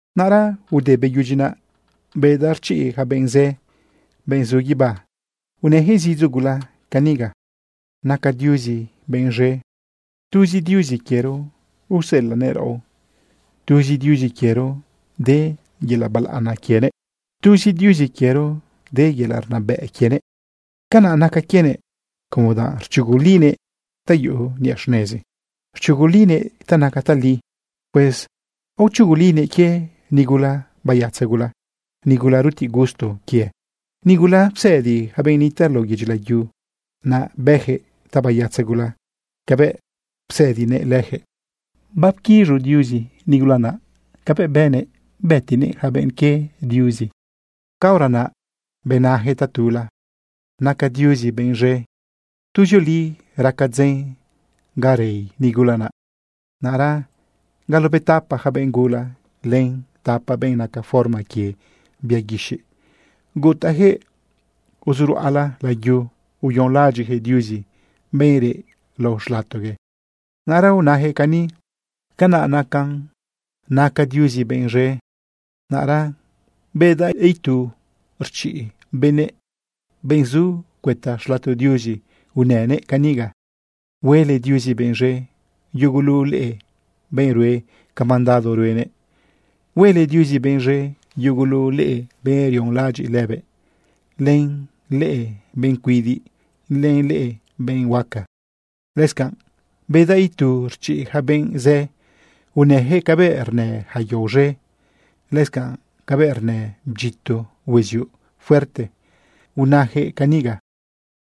Naꞌra ude beyudyi naꞌ bedaꞌ rchiꞌ ja benꞌ zë, benꞌ zu guibá, unëjëꞌ zidzo gula caniga: Naca Diuzi benꞌ z̃e. Tuzi Diuzi quiero uselanëꞌ raꞌo. Tuzi Diuzi quiero de yelaꞌ balaꞌana quienëꞌ. Tuzi Diuzi quiero de yelaꞌ rnabëꞌ quienëꞌ. Canaꞌ naca quienëꞌ, como danꞌ rchugulinëꞌ ta yuꞌu niꞌa xnezi, rchugulinëꞌ ta naca tali. Pues aochugulinëꞌ quie nigula bayatza gula, nigula rutiꞌ gusto quië, nigula psëdi ja benꞌ nitaꞌ lao yedyi layu, naꞌ bëjëꞌ tabayatza gula cabëꞌ psëdinëꞌ lëjëꞌ. Bapquiz̃u Diuzi lënigula naꞌ cabëꞌ bënëꞌ bëtinëꞌ ja benꞌ quie Diuzi. Caora naꞌ benajëꞌ tatula: ―¡Naca Diuzi benꞌ z̃e! Tuzioli raca dzen ga rei nigula naꞌ. Naꞌra galobetapa ja benꞌ gula, len tapa benꞌ naca forma quie bia guixiꞌ, gutajëꞌ uzu ruꞌala layu uyonlaꞌadyiꞌjëꞌ Diuzi, benꞌ reꞌ lao xlatogue. Naꞌra unajëꞌ cani: ―¡Canaꞌ nacan! ¡Naca Diuzi benꞌ z̃e! Naꞌra bedaꞌ itu rchiꞌ benëꞌ, benꞌ zu cuëta xlato Diuzi, unënëꞌ caniga: Huele Diuzi benꞌ z̃e, yugulu leꞌe benꞌ rue ca mandado ruenëꞌ. Huele Diuzi benꞌ z̃e, yugulu leꞌe benꞌ rionlaꞌadyiꞌ lëbëꞌ, len leꞌe benꞌ cuidiꞌ, len leꞌe benꞌ huaca. Lëscanꞌ bedaꞌ itu rchiꞌ ja benꞌ zë. Unëyaquëꞌ cabëꞌ rnë ja yao z̃e, lëscanꞌ cabëꞌ rnë bdyito hueziuꞌ fuerte. Unajëꞌ caniga: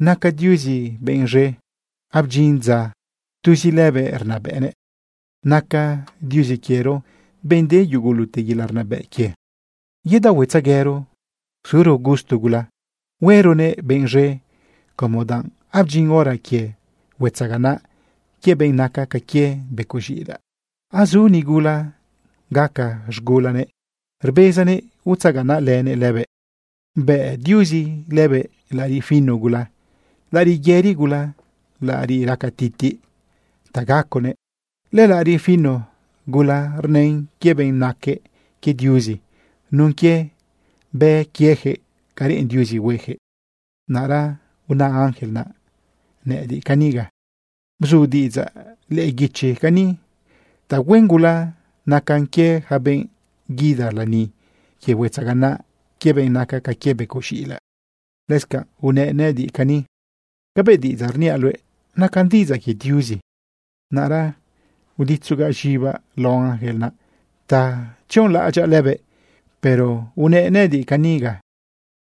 ¡Naca Diuzi benꞌ z̃e! Abdyin dza tuzi lëbëꞌ rnabëꞌnëꞌ. Naca Diuzi quiero benꞌ de yugulute yelaꞌ rnabëꞌ quie. Yedaohuetzeguero, suro gusto gula, hueronëꞌ benꞌ z̃e, como danꞌ abdyin hora quie huetzaganaꞌ quie benꞌ naca ca quie becoꞌ z̃iꞌilaꞌ. Azu nigula gaca z̃gulanëꞌ, rbezanëꞌ utzaganaꞌlënëꞌ lëbëꞌ. Bëꞌ Diuzi lëbëꞌ laꞌariꞌ fino gula, laꞌariꞌ yëri gula, laꞌariꞌ raca titiꞌ ta gaconëꞌ. Lëlaꞌariꞌ fino gula rnën quie benꞌ naque quie Diuzi nun quie bë quiejëꞌ ca reꞌen Diuzi huejëꞌ. Naꞌra una ángel naꞌ nëꞌëdiꞌ caniga: ―Bzu diꞌidzaꞌ lëꞌë guichi cani: “Tahuen gula nacan quie ja benꞌ guida lani quie huetzaganaꞌ quie benꞌ naca ca quie becoꞌ z̃iꞌilaꞌ.” Lëscanꞌ unëꞌ nëꞌëdiꞌ cani: ―Cabëꞌ diꞌidzaꞌ rniaꞌ luëꞌ nacan diꞌidzaꞌ quie Diuzi. Naꞌra uditzogaꞌ z̃ibaꞌ lao ángel naꞌ ta tzionlaꞌadyaꞌ lëbëꞌ, pero unëꞌ nëꞌëdiꞌ caniga: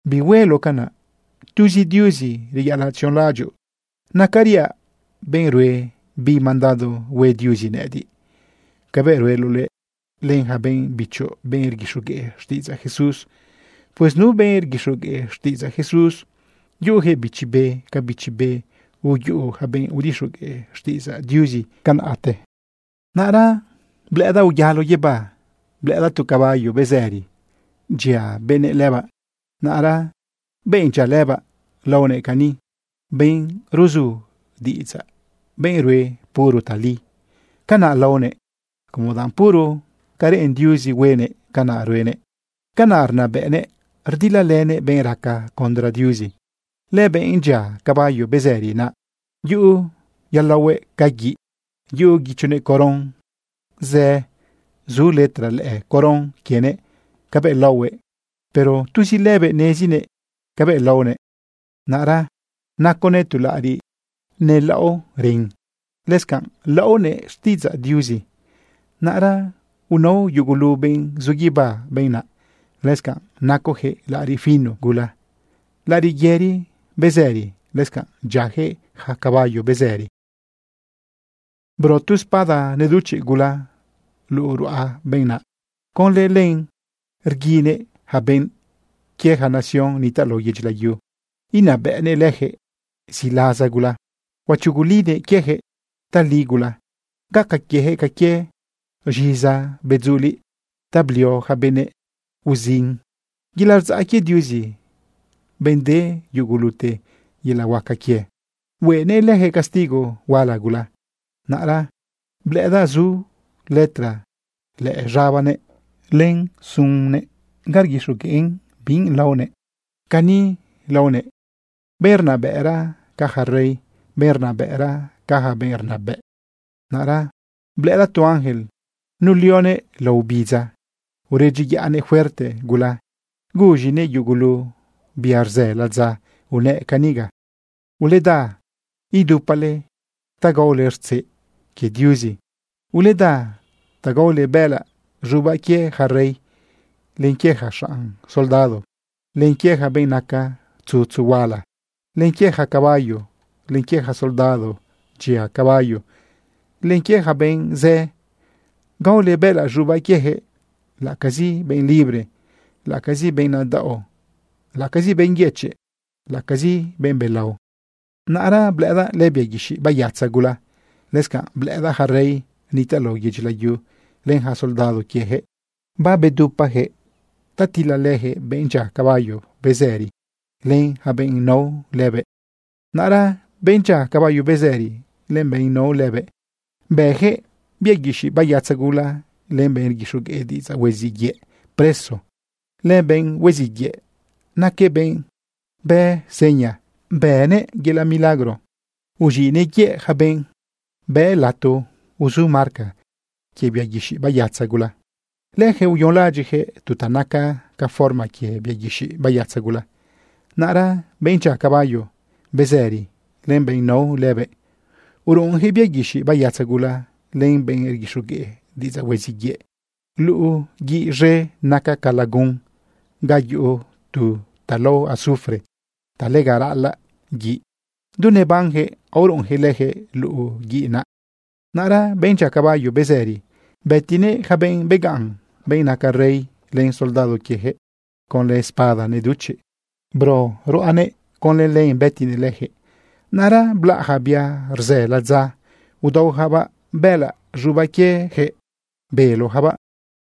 ―Bihueloꞌ canaꞌ. Tuzi Diuzi reyaꞌalaꞌ tzionlaꞌadyoꞌ. Nacariaꞌ benꞌ rue bi mandado hue Diuzi nëꞌëdiꞌ cabëꞌ rueloꞌ luëꞌ, len ja benꞌ bichoꞌ, benꞌ rguixogueꞌ xtiꞌidzaꞌ Jesús. Pues nu benꞌ rguixogueꞌ xtiꞌidzaꞌ Jesús, yuꞌujëꞌ Bichi Be ca Bichi Be uyuꞌu ja benꞌ udixogueꞌ xtiꞌidzaꞌ Diuzi tiempote. Naꞌra blëꞌëdaꞌ uyalo guibá, blëꞌëdaꞌ tu caballo bezëri dyia benëꞌ lëbaꞌ. Naꞌra benꞌ dyia lëbaꞌ laonëꞌ cani: “Benꞌ ruzu diꞌidzaꞌ, benꞌ rue puro tali.” Canaꞌ laonëꞌ, como danꞌ puro ca reꞌen Diuzi huenëꞌ, canaꞌ ruenëꞌ. Canaꞌ rnabëꞌnëꞌ rdilalënëꞌ benꞌ raca condra Diuzi. Lëbenꞌ dyia caballo bezëri, naꞌ yuꞌu yulaohuëꞌ ca guiꞌ. Yuꞌu guichonëꞌ coron zë. Zu letra lëꞌë coron quienëꞌ cabëꞌ laohuëꞌ, pero tuzi lëbëꞌ nezinëꞌ cabëꞌ laonëꞌ. Naꞌra naconëꞌ tu laꞌariꞌ nelaꞌo ren. Lëscanꞌ laonëꞌ: “Xtiꞌidzaꞌ Diuzi.” Naꞌra unao yugulu benꞌ zu guibá benꞌ naꞌ. Lëscanꞌ nacojëꞌ laꞌariꞌ fino gula, laꞌariꞌ yëri bezëri. Lëscanꞌ dyiajëꞌ ja caballo bezëri. Bro tu espada neduchiꞌ gula luꞌu ruꞌa benꞌ naꞌ. Conlë len rguinëꞌ ja benꞌ quie ja nación nitaꞌ lao yedyi layu. Inabëꞌnëꞌ lëjëꞌ ziꞌlaza gula. Huachugulinëꞌ quiejëꞌ tali gula. Gaca quiejëꞌ ca quie z̃iza bedzuliꞌ ta blio ja benëꞌ uzin. Yelaꞌ rdzaꞌ quie Diuzi, benꞌ de yugulute yelaꞌ huaca quie, huenëꞌ lëjëꞌ castigo huala gula. Naꞌra blëꞌëdaꞌ zu letra lëꞌë z̃abanëꞌ len sunnëꞌ ga rguixogueꞌn bi laonëꞌ. Cani laonëꞌ: “Benꞌ rnabëꞌra ca ja rey, benꞌ rnabëꞌra ca ja benꞌ rnabëꞌ.” Naꞌra blëꞌëdaꞌ tu ángel nulioguëꞌ lao obidza uredyiyaꞌnëꞌ fuerte gula guz̃inëꞌ yugulu bia rzë ladza. Unëꞌ caniga: ―Uleda, idupale ta gaole rtzeꞌ quie Diuzi. Uleda ta gaole bëꞌëlaꞌ z̃ubaꞌ quie ja rey, len quie ja xanꞌ soldado, len quie ja benꞌ naca tzutzu huala, len quie ja caballo, len quie ja soldado dyia caballo, len quie ja benꞌ zë. Gaole bëꞌëlaꞌ z̃ubaꞌ quiejëꞌ, laꞌacazi benꞌ libre, laꞌacazi benꞌ nadaꞌo, laꞌacazi benꞌ yëchiꞌ, laꞌacazi benꞌ belao. Naꞌra blëꞌëdaꞌ lëbia guixiꞌ bayatza gula, lëscanꞌ blëꞌëdaꞌ ja rey nitaꞌ lao yedyi layu len ja soldado quiejëꞌ. Babedupajëꞌ ta tilalëjëꞌ benꞌ dyia caballo bezëri len ja benꞌ nao lëbëꞌ. Naꞌra benꞌ dyia caballo bezëri len benꞌ nao lëbëꞌ, bëjëꞌ bia guixiꞌ bayatza gula len benꞌ rguixogueꞌ diꞌidzaꞌ hueziꞌ yëꞌ preso. Lëbenꞌ hueziꞌ yëꞌ naquëꞌ benꞌ bë seña, bënëꞌ yelaꞌ milagro uz̃iꞌnëꞌ yëꞌ ja benꞌ bë lato uzu marca quie bia guixiꞌ bayatza gula. Lëjëꞌ uyonlaꞌadyiꞌjëꞌ tu ta naca ca forma quie bia guixiꞌ bayatza gula. Naꞌra benꞌ dyia caballo bezëri len benꞌ nao lëbëꞌ, uruꞌunjëꞌ bia guixiꞌ bayatza gula len benꞌ rguixogueꞌ diꞌidzaꞌ hueziꞌ yëꞌ luꞌu guiꞌ z̃e naca ca lagun ga yuꞌu tu ta lao azufre ta lega raꞌalaꞌ guiꞌ. Du nebanjëꞌ aoruꞌunjëꞌ lëjëꞌ luꞌu guiꞌ naꞌ. Naꞌra benꞌ dyia caballo bezëri bëtinëꞌ ja benꞌ begaꞌn, benꞌ naca rey len soldado quiejëꞌ. Conlë espada neduchiꞌ bero ruꞌanëꞌ, conlë len bëtinëꞌ lëjëꞌ. Naꞌra blaꞌ ja bia rzë ladza udaojabaꞌ bëꞌëlaꞌ z̃ubaꞌ quiejëꞌ belojabaꞌ.